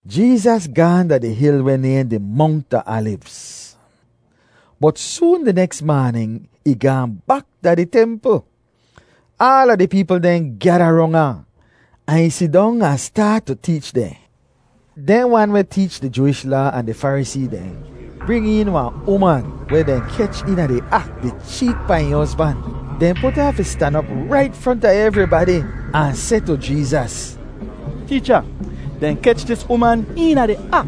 Jeezas gaahn da di hil weh nayhn di Mongt a Alivz, bot soon di neks maanin ih gaahn bak da di templ. Aala di peepl dehn gyada rong ahn, ahn ih sidong ahn staat tu teech dehn. Dehn wan weh teech di Jooish Laa ahn di Farisee dehn bring een wahn uman weh dehn kech eena di ak di cheet pahn ih hozban. Dehn put ahn fi stan op rait fronta evribadi ahn seh tu Jeezas, “Teecha, dehn kech dis uman eena di ak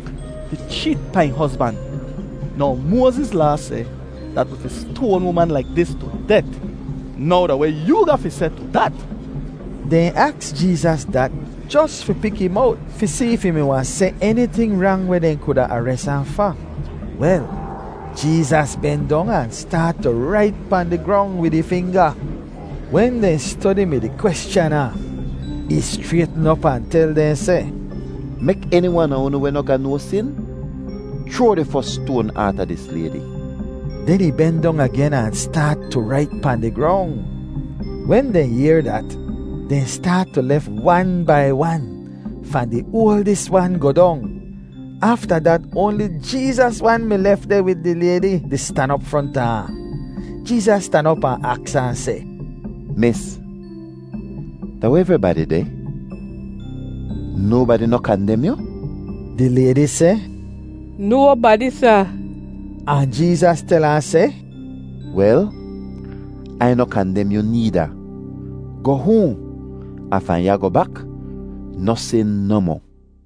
di cheet pahn ih hozban. Now Moaziz Laa seh dat wi fi stoan uman laik dis tu det. Now da weh yoo ga fi seh tu dat?” Dehn aks Jeezas dat jos fi pik ih mowt fi si if ih mi wahn seh eniting rang weh dehn kuda ares ahn fa. Wel, Jeezas ben dong ahn staat tu rait pahn di grong wid ih finga. Wen dehn stodi mi-di kweschan ahn, ih schraytn op ahn tel dehn seh, “Mek eni wan a unu weh noh ga no sin chroa di fos stoan aata dis laydi.” Den ih ben dong agen ahn staat tu rait pahn di grong. Wen dehn yehr dat, dehn staat tu lef wan bai wan, fahn di oaldis wan goh dong; afta dat oanli Jeezas wan mi lef deh wid di laydi di stan op fronta ahn. Jeezas stan op ahn aks ahn seh, “Mis, da weh evribadi deh? Nobadi noh kandem yu?” Di laydi seh, “Nobadi, Sa.” Ahn Jeezas tel ahn seh, “Wel, Ai noh kandem yu needa. Goh hoahn, ahn fahn ya goh bak, noh sin nohmoh.”]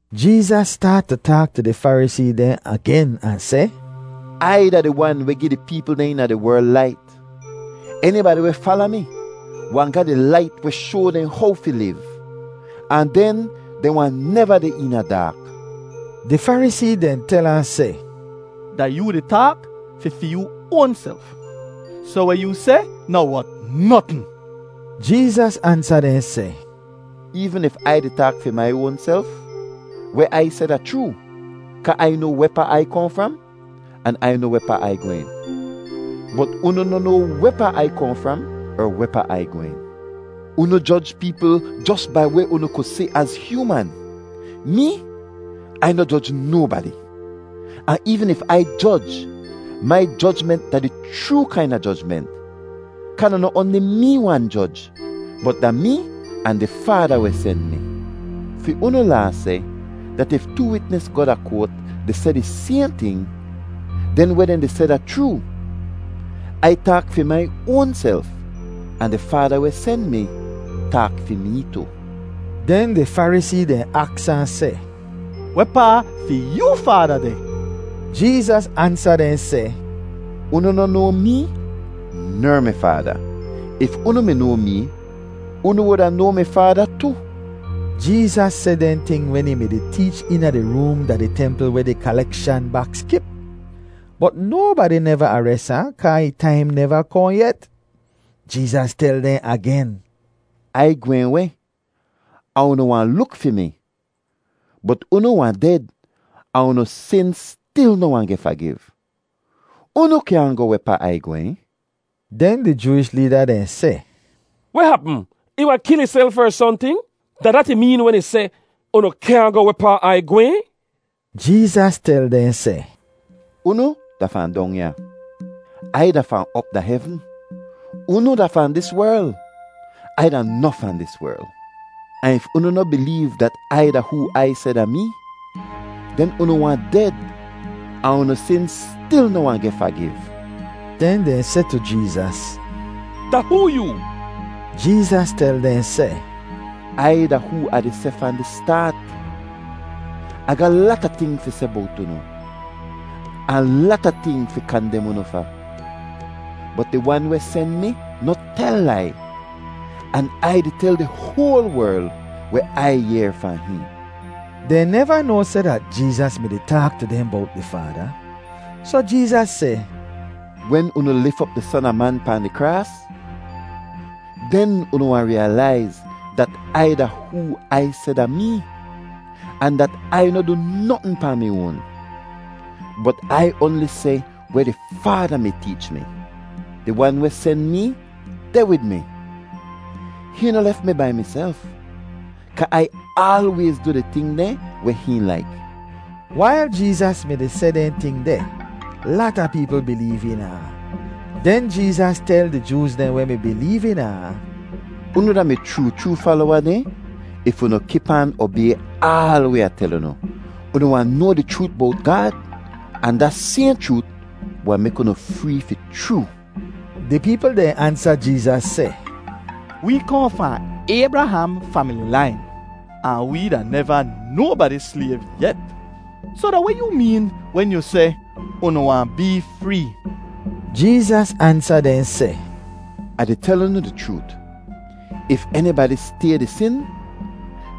Jeezas staat tu taak tu di Farisee dehn agen ahn seh, “Ai da di Wan weh gi di peepl dehn eena di werl lait. Enibadi weh fala mi wahn ga di lait weh shoa dehn how fi liv, ahn den dehn wahn neva deh eena daak.” Di Farisee dehn tel ahn seh, “Da yoo di taak fi fi yoo oanself, soh weh yoo seh noh wot notn.” Jeezas ansa dehn seh, “Eevn if Ai di taak fi mai oanself, weh Ai seh da chroo kaa Ai noa wehpaa Ai kohn fram, an Ai noa wehpaa Ai gwehn. Bot unu noh noa wehpaa Ai kohn fram er wehpaa Ai gwehn. Unu joj peepl jos bai weh unu ku si az hyooman. Mee, Ai noh joj nobadi. Ahn eevn if Ai joj, mai jojment da di chroo kaina jojment kaa da noh oanli mee wan joj, bot da mee ahn di Faada weh sen mi. Fi unu Laa seh dat if too witnis goh da koat di seh di sayhn ting, den weh dehn di seh da chroo. Ai taak fi mai oanself, ahn di Faada weh sen mi taak fi mee tu.” Den di Farisee dehn aks ahn seh, “Wehpaa fi yoo Faada deh?” Jeezas ansa dehn seh, “Unu noh noa mee ner mi Faada. If unu mi noa mee, unu wuda noa mi Faada tu.” Jeezas seh dehn ting wen ih mi-di teech eena di room da di templ weh di kalekshan baks kip. Bot nobadi neva ares ahn kaa ih taim neva kohn yet. Jeezas tel dehn agen, “Ai gwehn weh, ahn unu wahn luk fi mi, bot unu wahn ded ahn unu sin stil noh wahn geh fagiv. Unu kyaahn goh wehpaa Ai gwehn.” Den di Jooish leeda dehn seh, “Weh hapm? Ih wahn kil ihself er sohnting? Da dat ih meen wen ih seh, ‘Unu kyaahn goh wehpaa Ai gwehn?’” Jeezas tel dehn seh, “Unu da fahn dong ya; Ai da fahn op da hevn. Unu da fahn dis werl; Ai da noh fahn dis werl. Ahn if unu noh bileev dat Ai da hoo Ai seh da mee, den unu wahn ded, ahn unu sin stil noh wahn geh fagiv.” Den dehn seh tu Jeezas, “Da hoo yoo?” Jeezas tel dehn seh, “Ai da hoo Ah di seh fahn di staat. Ah ga lata ting fi seh bowt unu, ahn lata ting fi kandem unu fa. Bot di Wan weh sen mi noh tel lai, an Ai di tel di hoal werl weh Ai yehr fahn hihn.” Dehn neva noa seh dat Jeezas mi-di taak tu dehn bowt di Faada. Soh Jeezas seh, “Wen unu lif op di Son a Man pahn di kraas, den unu wahn riyalaiz dat Ai da hoo Ai seh da mee, ahn dat Ai noh du notn pahn mi oan, bot Ai oanli seh weh di Faada mi teech mi. Di wan weh sen mee deh wid mi. Hihn noh lef mi bai miself, kaa Ai aalwayz du di ting dehn weh hihn laik.” Wail Jeezas mi-di seh dehn ting deh, lata peepl bileev eena ahn. Den Jeezas tel di Jooz dehn weh mi bileev eena ahn, “Unu da mi chroo chroo falowa dehn if unu kip aan obay aal weh Ah tel unu. Unu wahn noa di chroot bowt Gaad, ahn da sayhn chroot wahn mek unu free fi chroo.” Di peepl dehn ansa Jeezas seh, “Wee kohn fahn Aybraham famili lain, ahn wee da neva nobadi slayv yet. Soh da weh yoo meen wen yu seh, ‘Unu wahn bee free?’” Jeezas ansa dehn seh, “Ah di tel unu di chroot, if enibadi stay di sin,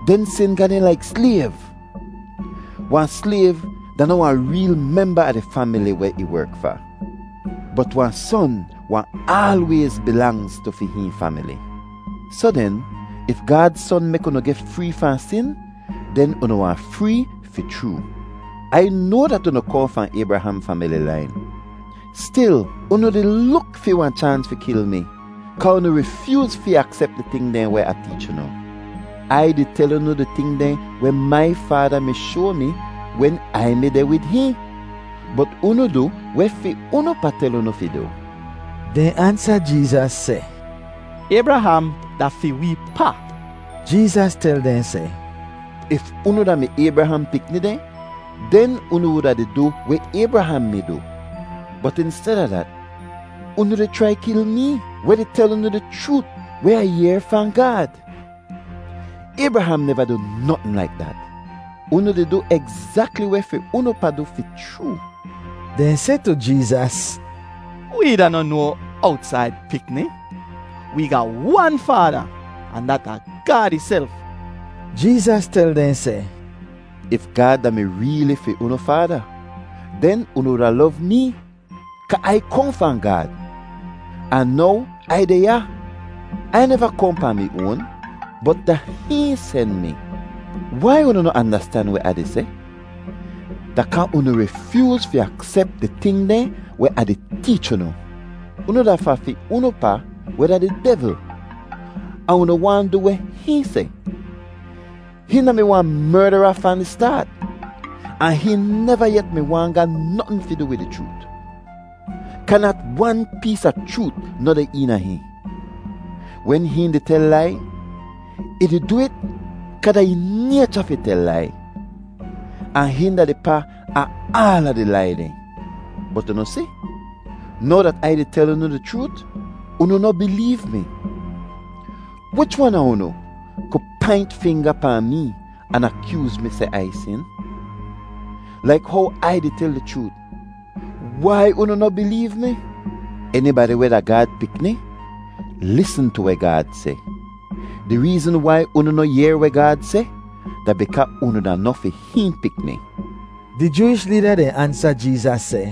den sin ga dehn laik slayv. Wahn slayv da noh wahn reel memba a di famili weh ih werk fa; bot wahn son wahn aalwayz bilangz tu fi hihn famili. Soh den, if Gaad Son mek unu geh free fahn sin, den unu wahn free fi chroo. Ai noa dat unu kohn fahn Aybraham famili lain; stil, unu di luk fi wahn chaans fi kil mi kaa unu rifyooz fi aksep di ting dehn weh Ah teech unu. Ai di tel unu di ting dehn weh mai Faada mi shoa mi wen Ai mi deh wid hihn; bot unu du weh fi unu pa tel unu fi du.” Dehn ansa Jeezas seh, “Aybraham da fi wee pa.” Jeezas tel dehn seh, “If unu da-mi Aybraham pikni dehn, den unu wuda di du weh Aybraham mi du, bot insteda dat, unu di chrai kil mee, weh di tel unu di chroot weh Ah yehr fahn Gaad. Aybraham neva du notn laik dat. Unu di du egzakli weh fi unu pa du fi chroo.” Dehn seh tu Jeezas, “Wee da noh no owtsaid pikni; wee ga wan Faada, ahn dat da Gaad ihself.” Jeezas tel dehn seh, “If Gaad da-mi reeli fi unu Faada, den unu wuda lov mee kaa Ai kohn fahn Gaad, ahn now Ai deh ya. Ai neva kohn pahn mi oan, bot da hihn sen mi. Wai unu noh andastan weh Ah di seh? Da kaa unu rifyooz fi aksep di ting dehn weh Ah di teech unu. Unu da fahn fi unu pa weh da di devl, ahn unu waahn du weh hihn seh. Hihn da-mi wahn merdara fahn di staat, ahn hihn neva yet mi waahn ga notn fi du wid di chroot, kaa nat wan pees a chroot noh deh eena hihn. Wen hihn di tel lai, ih di du it kaa da ih naycha fi tel lai, ahn hihn da di pa a aala di lai dehn. Bot unu si, now dat Ai di tel unu di chroot, unu noh bileev mi. Wich wan a unu ku paint finga pahn mee ahn akyooz mi seh Ai sin? Laik how Ai di tel di chroot, wai unu noh bileev mi? Enibadi weh da Gaad pikni lisn tu weh Gaad seh. Di reezn wai unu noh yehr weh Gaad seh, da bikaa unu da noh fi hihn pikni.” Di Jooish leeda dehn ansa Jeezas seh,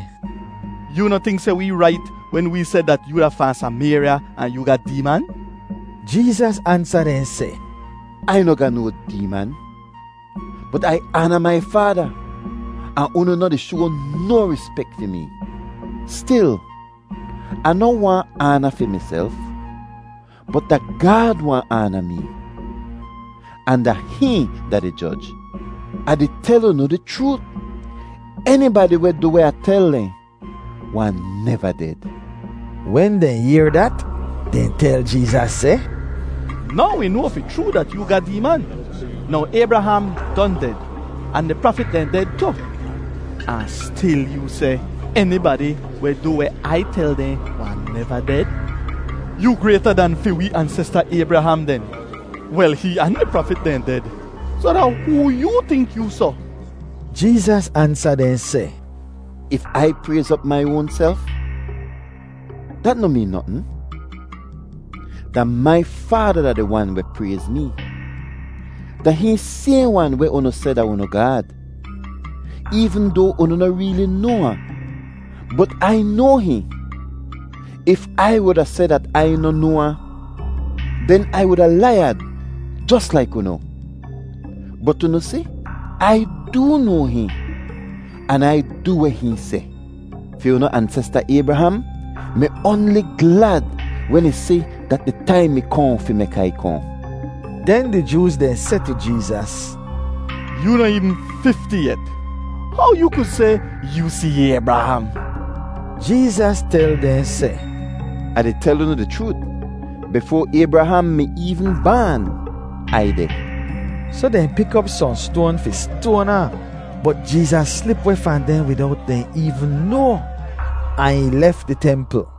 “Yoo noh tink seh wee rait wen wee seh dat yoo da fahn Samayrya ahn yoo ga deeman?” Jeezas ansa dehn seh, “Ai noh ga no deeman, bot Ai aana mai Faada, ahn unu noh di shoa no rispek fi mee. Stil, Ah noh waahn aana fi miself, bot da Gaad waahn aana mee, ahn da hihn da di joj. Ah di tel unu di chroot, enibadi weh du weh Ah tel dehn wahn neva ded.” Wen dehn yehr dat, dehn tel Jeezas seh, “Now wi noa fi chroo dat yoo ga deeman! Now Aybraham don ded, ahn di prafit dehn ded tu, ahn stil yoo seh, ‘Enibadi weh du weh Ai tel dehn wahn neva ded’? Yoo grayta dan fi wee ansesta Aybraham den? Wel, hihn ahn di prafit dehn ded. Soh da hoo yoo tink yoo soh?” Jeezas ansa dehn seh, “If Ai prayz op mai oanself, dat noh meen notn. Da mai Faada da di Wan weh prayz mee. Da hihn sayhn wan weh unu seh da unu Gaad, eevn doa unu noh reeli noa ahn. Bot Ai noa hihn. If Ai wuda seh dat Ai noh noa ahn, den Ai wuda laiyad jos laik unu. Bot unu si, Ai doo noa hihn, an Ai du weh hihn seh. Fi unu ansesta Aybraham mi oanli glad wen ih si dat di taim mi kohn fi mek Ai kohn.” Den di Jooz dehn seh tu Jeezas, “Yoo noh eevn fifti yet. How yoo ku seh yoo si Aybraham?” Jeezas tel dehn seh, “Ah di tel unu di chroot, bifoa Aybraham mi eevn baan, Ai deh!” Soh dehn pik op sohn stoan fi stoan ahn, bot Jeezas slip weh fahn dehn widowt dehn eevn noa, ahn ih lef di templ.